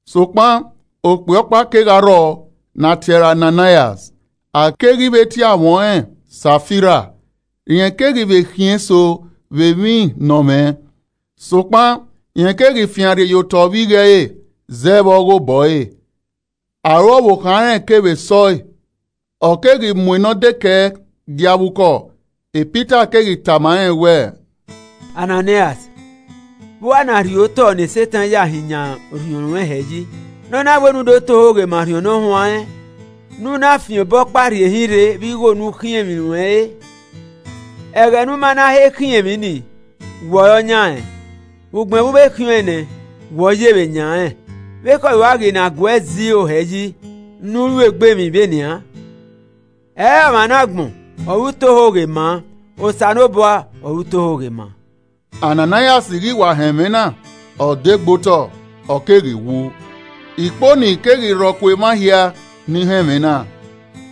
Sokpan, okpia ọkpa kegha rrọọ ne a tie ẹre Ananaias, a keghi vbe tie amwẹ ọnrẹn Safira. Rẹn keghi vbe khiẹn eso vbe emwi ne ọ mwẹ. Sokpan rẹn keghi fian rhie ye otọ vbe igho ẹre, zẹ vbe ọghe obọ ẹre, aro ọvbokhan rẹn kevbe sẹ ọe, ọ keghi mu ne ọ dekẹe gie avbe ukọ. Pita keghi tama rẹn wẹẹ, “Ananaias, vbe u a rhie otọ ne Setan ya hin yan orhiọn ruẹn hẹ yi, ne ọ na wẹ ne u do ta ohoghe ma Orhiọn Ne Ọ Huanrẹn, ne u na fian obọkpa rhie hin rre Vbe igho ne u khiẹn emwi ne u mwẹ re? Ẹghẹ ne u ma na he khiẹn emwi ni, wẹ ọre ọ yan rẹn. Ugbẹn vbe u vbe khiẹn ọẹn nẹ, wẹ ọ ye vbe yan rẹn. Vbe ekhọe ruẹ ghi na gue zẹ iro hẹ yi ne u ru egbe emwi vbe nian? Ẹre ọmwa ne agbọn ọre u ta ohoghe ma, Osanobua ọre u ta ohoghe ma.” Ananaias ghi wa họn ẹmwẹ na, ọ degbe otọ, ọ keghi wu. Ikponi keghi rhọ ku emwa hia ni họn ẹmwẹ na.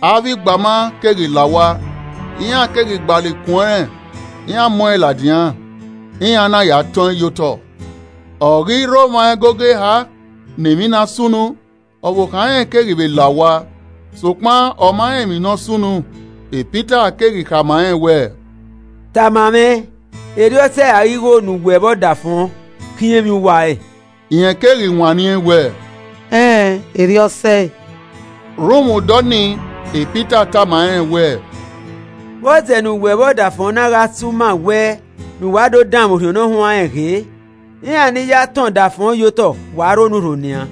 Avbe igbama keghi la owa, iran keghi gbalọ ikun ẹnrẹn, iran mu ẹn ladian, iran na ya tọn ẹn ye otọ. Ọ ghi rre omwa ẹgogo eha ne emwi na sunu, ọvbokhan rẹn keghi vbe la owa, sokpan ọ ma rẹn emwi ne ọ sunu. Pita keghi khama rẹn wẹẹ, “Tama mwẹ, erriọ ọ sẹe ra ighe igho ne uwẹ vbe ọdafọn khiẹn emwi uwa re?” Rẹn keghi wanniẹn wẹẹ, “Ẹn, erriọ ọ sẹe.” Rhunmwuda ọnii, Pita tama rẹn wẹẹ, “Vbọzẹ ne uwẹ vbe ọdafọn na gha si uma wẹ, ne uwa do danmwẹ Orhiọn Nọyaẹnmwa ghee? Iran ni ya tọn ọdafọn ye otọ wa rre onurho nian,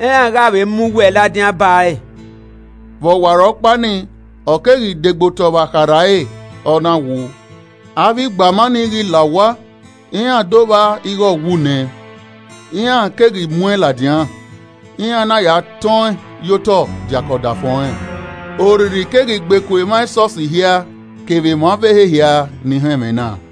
iran gha vbe mu uwẹ ladian ba ẹre.” Vbe ọwarọkpa nii, ọ keghi de gbe otọ vbe akharha ẹre, ọ na wu. Avbe igbama nii ghi la owa, iran do vba ighe ọ wu nẹ, iran keghi mu ẹn ladian, iran na ya tọn ẹn ye otọ diake ọdafọn ọnrẹn. Orrirri keghi gbe ku emwa esọsi hia kevbe emwa ọvbehe hia ni họn ẹmwẹ na.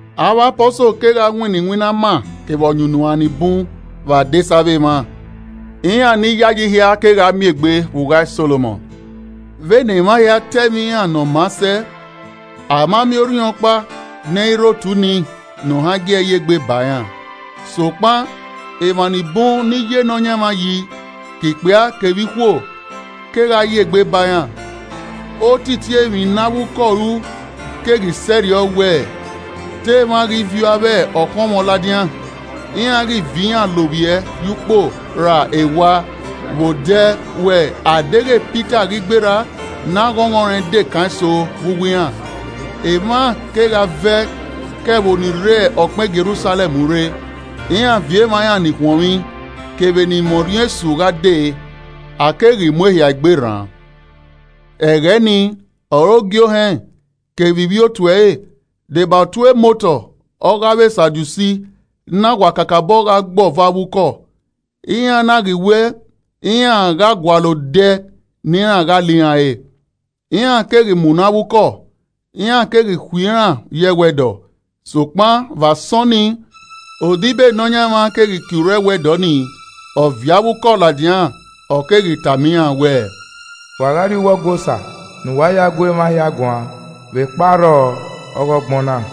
Avbe Apọsol kegha winna iwinna ama kevbe ọyunnuan ni bun vbe adesẹ avbe emwa. Iran ni yayi hia kegha miẹn egbe vbe Ugha Solomọn. Vbene emwa hia ta ẹmwẹ iran ne ọ maa sẹ, a ma miẹn orhiọnkpa ne ẹ i rre otu ni, ne ohan gie ẹe ye egbe ba iran. Sokpan, emwa ni bun ni ya Nọyaẹnmwa yi, ke ikpia kevbe ikhuo, kegha ya egbe ba iran. Otiti emwi ne avbe ukọ ru keghi sẹrriọ wẹ, te emwa ghi viọ avbe ọkhọnmwọ ladian, iran ghi viọ iran lovbiẹ ye ukpo ra ewa vbe odẹ wẹ, a deghẹ pita ghi gberra, ne aghọnghọn rẹn de kan eso vbe uwu iran. Emwa kegha vẹ ke ẹvbo ni rre ọkpẹn Jerusalẹm rre, iran viọ emwa iran ni khuọnmwi kevbe ni mwẹ orhiọn esu gha de, a keghi mu ehia egbe rran. Ẹghẹ ni ọre ogie ohẹn kevbe ivbi otu ẹre, deba otu emotọ ọghe avbe Sadusi, na wa kakabọ gha gbe ọvo avbe ukọ, iran na ghi wẹ, iran gha gualọ odẹ ne iran gha la iran re. Iran keghi munọ avbe ukọ, iran keghi khui iran ye ẹwẹdọ. Sokpan vbe asọn nii, odibo e Nọyaẹnmwa keghi kie urho ẹwẹdọ nii, ọ viọ avbe ukọ ladian, ọ keghi tama iran wẹẹ, “Wa gha rrie uwu Ọgua Osa ne uwa ya gu emwa hia guan vbe kpa arrọọ ọghe ọgbọn na.”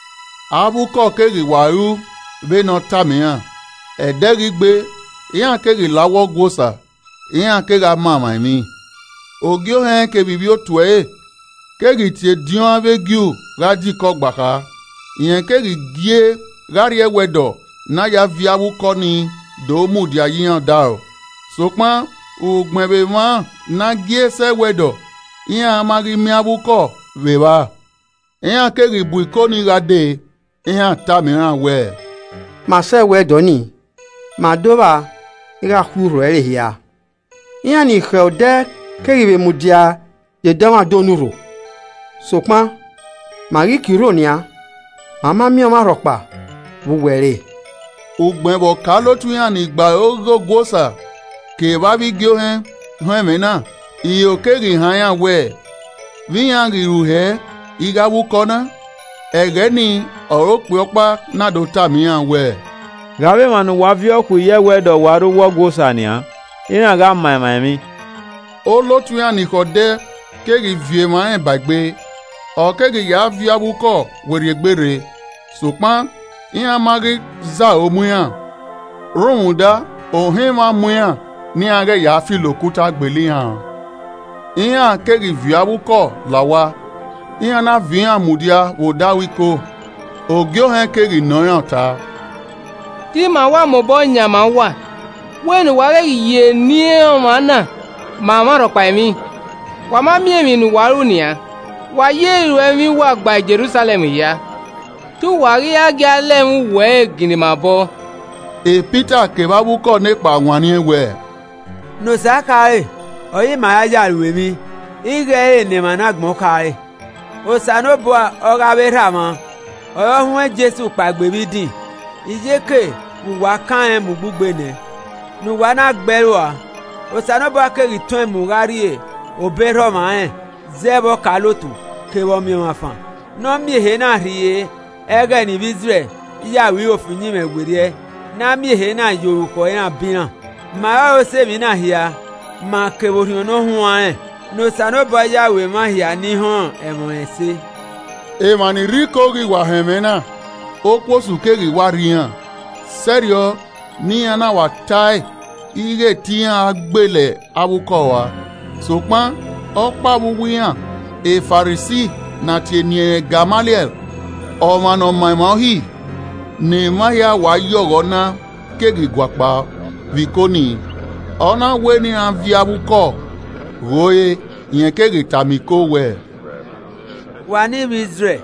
Avbe ukọ keghi wa ru vbene ọ tama iran. Ẹdẹ ghi gbe, iran keghi la uwu Ọgua Osa, iran kegha ma emwa emwi. Ogie Ohẹn kevbe ivbi otu ẹre keghi tie ediọn avbe Ju gha die iko ọgbakha, rẹn keghi gie gha rrie ẹwẹdọ ne a ya viọ avbe ukọ nii do mudia ye iran odaro. Sokpan ugbẹn vbe emwa ne a gie sẹ ẹwẹdọ, iran ma ghi miẹn avbe ukọ vbe evba, iran keghi bu Iko ni gha dee, iran tama iran wẹẹ, “Ma sẹ ẹwẹdọ ni, ma do vba ighẹ a khui urho ẹre hia, iran ni khẹ odẹ keghi vbe mudia ye dọmwadẹ onurho, sokpan ma ghi kie urho nian, ma ma miẹn ọmwarhọkpa vbe uwu ẹre!” Ugbẹn vbe ọkaolotu iran ni gbe aro ghe Ọgua Osa kevbe avbe igie ohẹn họn ẹmwẹ na, iro keghi han iran wẹ, vbe iran ghi ru hẹ ighẹ avbe ukọ na? Ẹghẹ ni ọre okpia ọkpa na do tama iran wẹẹ, “Ghe avbe emwa ne uwa viọ khui ye ẹwẹdọ wa rre uwu Ọgua Osa nian, iran gha ma emwa emwi.” Olotu iran ni khẹ odẹ keghi viọ emwa rẹn ba egbe, ọ keghi ya viọ avbe ukọ werriegbe rre. Sokpan iran ma ghi zaro mu iran, rhunmwuda ohan emwa mu iran ne iran ghẹ ya filo okuta gbele iran an. Iran keghi viọ avbe ukọ la owa, iran na viọ iran mudia vbe odaro Iko, Ogie Ohẹn keghi nọ iran ọta: “Te ima wa mobọ yan ma uwa wẹ ne uwa ghẹ ghi ya eni ọmwa na ma ọmwarhọkpa emwi. Wa ma miẹn emwi ne uwa ru nian. Wa ya iruẹmwi uwa gba Jerusalẹm hia, te uwa ghi ra gie a lẹ ẹmwẹ uwu ẹre ginna ima obọ.” Pita kevbe avbe ukọ nekpa wanniẹn wẹẹ, “Ne Osa khare ọre ima ra ya ru emwi ighẹ ẹ i re ne emwi ne agbọn khare. Osanobua ọ ghe avbe erha mwa ọre ọ huẹn Jesu kpaegbe vbe idin iyeke vbe uwa kan rẹn mu ugbugbe nẹ, ne uwa na gbe ẹe rua. Osanobua keghi tọn ẹn mu gha rrie obọ erha ọmwa ẹnrẹn zẹ vbe ọkaolotu kevbe Ọmiọnmwafan, ne ọ miẹn ehe na rhie ẹghẹ ne ivbi Izrẹl ya ro iro fi uyinmwẹ werriẹ, ne a miẹn ehe na ya orukhọ iran bọ iran. Ma ọrọre osẹe emwi na hia, ma kevbe Orhiọn Ne Ọ Huanrẹn ne Osanobua ya ru emwa hia ni họn ẹmwẹ ọnrẹn ẹse.” Emwa ni rre Iko ghi wa họn ẹmwẹ na, okuosu keghi wa rri iran, sẹrriọ ne iran na wa ta ẹe ighẹ te iran gbele avbe ukọ rua. Sokpan, ọkpa vbe uwu iran, e Farisi ne a tie eni ẹnrẹn Gamaliẹl, ọmwa ne ọma emwa uhi, ne emwa hia wa ya ọghọ na keghi guakpao vbe Iko ni, ọ na wẹ ne iran viọ avbe ukọ ghe ore. Rẹn keghi tama Iko wẹẹ, “Wa ne ivbi Izrẹl,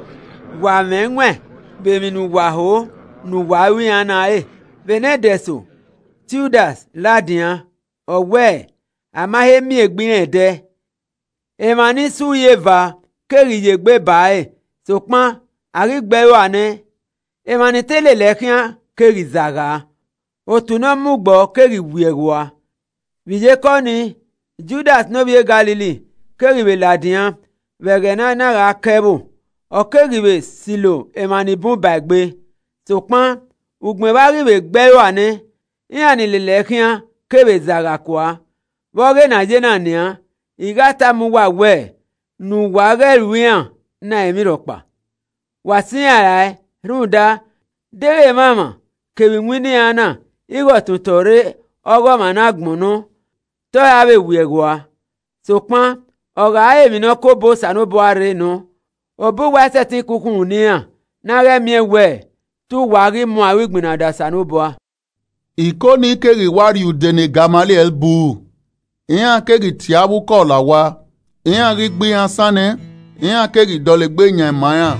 wa mwẹ ẹwaẹn vbe emwi ne uwa ho ne uwa ru iran na re. Vbe nẹdẹ eso, Tiudas ladian ọ wẹ a ma he miẹn egbe irẹn ẹdẹ, emwa ni sẹ uri eva keghi ye egbe ba ẹre. Sokpan, a ghi gbe ẹe rua nẹ, emwa ni te lele ẹe khian keghi zagha, otu ne ọ mu gbọọ keghi wiẹghẹ ua. Iyeke ọnii, Judas ne ovbi e Galili keghi vbe ladian vbe ẹghẹ ne a na gha ka ẹvbo, ọ keghi vbe silo emwa ni bun ba egbe, sokpan ugbẹn vbe a ghi vbe gbe ẹe rua nẹ, iran ni lele ẹe khian kevbe zagha kua. Vbe ọghe ne a ye na nian, I gha tama uwa wẹ ne uwa ghẹ ru iran na emwi rhọkpa. Wa sẹ iran rae rhunmwuda, deghẹ emwamwa kevbe iwinna iran na ighẹ ọtọn otọ rre ọghe ọmwa ne agbọn nọ, te ọ ra vbe wiẹghẹ ua. Sokpan, ọ gha re emwi ne ọ ke obọ Osanobua rre nọ, obọ uwa i sẹtin ke okhunmwu ne iran. Ne a ghẹ miẹn wẹ, te uwa ghi mu aro igbinna da Osanobua.” Iko ni keghi wa rhie ude ne Gamaliẹl buru. Iran keghi tie avbe ukọ la owa, iran ghi gbe iran asan nẹ, iran keghi dọlegbe yan ma iran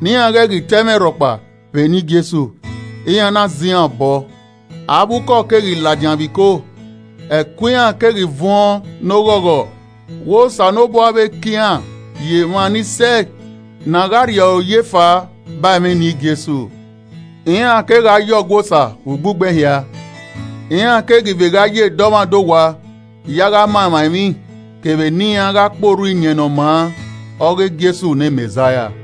ne iran ghẹ ghi ta ẹmwẹ rhọkpa vbe eni Jesu, iran na zẹ iran obọ. Avbe ukọ keghi ladian vbe iko, ẹko iran keghi vuọn ne oghọghọ wẹ Osanobua vbe ka iran ye emwa ni sẹe ni gha rri oya efaa ba ẹmwẹ eni Jesu. Iran kegha yo Ọgua Osa ugbugbẹhia. iran keghi vbe gha ya dọmwadẹ owa ya gha ma emwa emwi kevbe ne iran gha kpe orhu Iyẹn Ne ọ maa ọghe Jesu ne Mẹzaia.